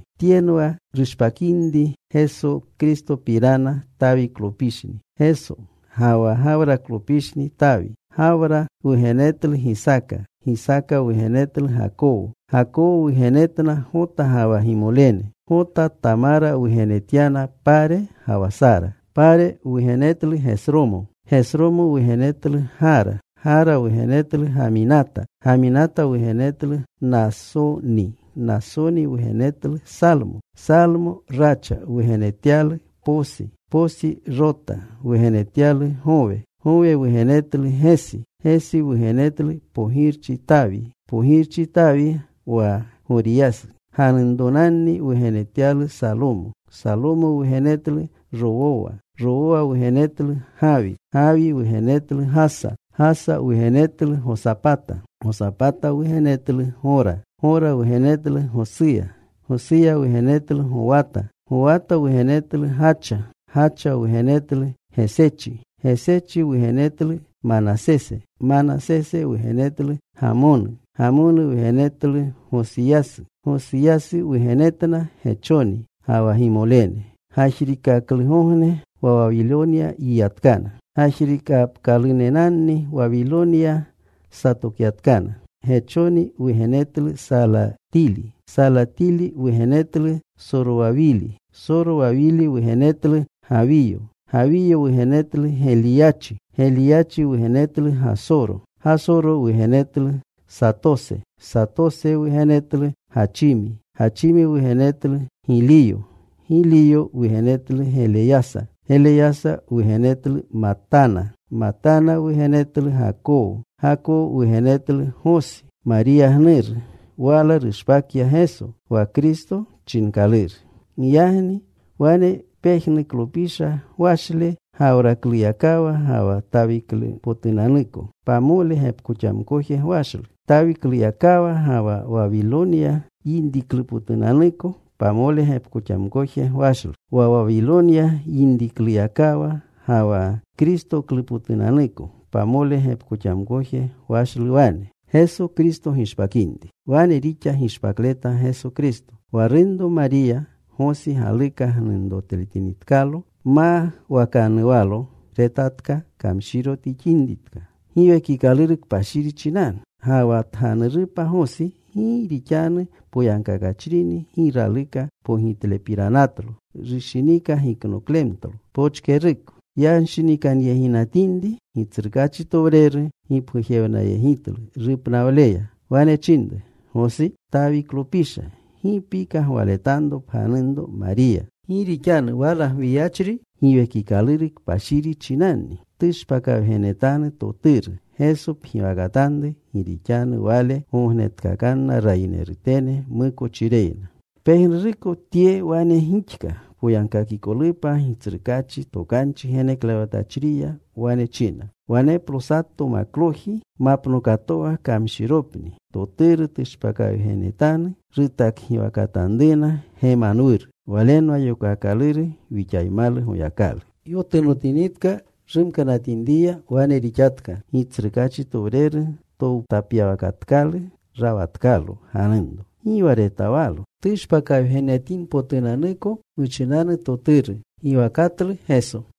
Tyenwa rushpakinri Geso Kristopirana. Tawiklopishni Geso, ga wa Gawraklopishni Tawi. Gawra wugenetlu Gisaaka. Gisaaka wugenetlu Gakowo. Gakowo wugenetna Gota ga wa gimolene. Gota Tamara wugenetyana Pare ga wa Sara. Pare wugenetlu Gesromo. Gesromo wugenetlu Gara. Gara wugenetlu Gaminata. Gaminata wugenetlu Naasoni. Naasoni wugenetlu Salmo. Salmo Racha wugenetyalu Poosi. Poosi Rota wugenetyalu Gowe. Gowe wugenetlu Gesi. Gesi wugenetlu pogirchi Tawi. Pogirchi Tawi, wa Goriyasu ganunronanni wugenetyalu Salomo. Salomo wugenetlu Rowowa. Rowowa wugenetlu Gawi. Gawi wugenetlu Gasa. Gasa wugenetlu Gosapata. Gosapata wugenetlu Gora. Gora wugenetlu Gosuya. Gosuya wugenetlu Gowata. Gowata wugenetlu Gacha. Gacha wugenetlu Gesechi. Gesechi wugenetlu Manasese. Manasese wugenetlu Gamonu. Gamonu wugenetlu Gosiyasu. Gosiyasu wugenetna Gechoni ga wa gimolene, gajriikaklugogne, wa Wawilonya yinitkana. Gajrikapkalunenanu Wawilonya satokyatkana. Gechoni wugenetlu Salatili. Salatili wugenetlu Sorowawili. Sorowawili wugenetlu Gawiyo. Gawiyo wugenetlu Geliyachi. Geliyachi wugenetlu Gasoro. Gasoro wugenetlu Satose. Satose wugenetlu Gachimi. Gachimi wugenetlu Giliyo. Giliyo wugenetlu Geleyasa. Geleyasa wugenetlu Matana. Matana wugenetlu Gakowo. Gakowo wugenetlu Gosi, Mariya gnuru. Wala rushpakya Geso, wa Kristo chinkaluru. Giyagni wane pejnuklopisha gwashle, Gawrakluyakawa ga wa Tawiklupotunanuko, pamole gepkoxamkoje gwashlu. Tawikluyakawa ga wa Wawilonya yinriklupotunanuko pamole gepkoxamkoje gwashlu. Wa Wawilonya yinrikluyakawa ga wa Kristoklupotunanuko, pamole gepkoxamkoje gwashlu wane. Wane rixa gishpakleta Geso Kristo. Wa runro Mariya, Gosi galuka gnunrotletinitkalo, mawakanuwalo, tetkatka kamshiro tixinritka Giwekikaluru Kpashiri chinanu. Ga wa tganurupa Gosi, gi rixanu poyagkakachrini gi raluka pogitlepiranatlo, rushinika giknoklemtlo pochkeruko. Yanshinikanyeginatinri, Gitsrukaachitowreru gipgujewnayegitlu rupnawleya. Wane chinru, “Gosi, Tawiklopisha, gi pika gwaletanro pganunropa Mariya. Gi rixanu wala gwiyachri Giwekikaluru Kpashiri chinanni. Tushpakawgenetanu toturu. Geso pgiwakatanru. Gi rixanu Wale gognetkakanna rayinerutene mukochireyna.” Pejnuruko tye wane gixka poyagkakikolupa Gitsrukaachi tokanu, tokanchi geneklewatachriya. Wane china: Waneplo sato makloji mapnokatowa kamshiropni. Toturu tushpakawgenetanu. Rutakgiwakatanruna Gemanwuru. Walenwa yokaakaluru: Wixaymalu Goyakalu. Yotunotinitka rumkanatinriya, wane rixatka Gitsrukaachi towreru towtapyawakatkalu. Rawatkalo ganunro. Gi wa retawalo tushpakawgenetinpotunanuko muchinanu toturu. Giwakatlu Geso.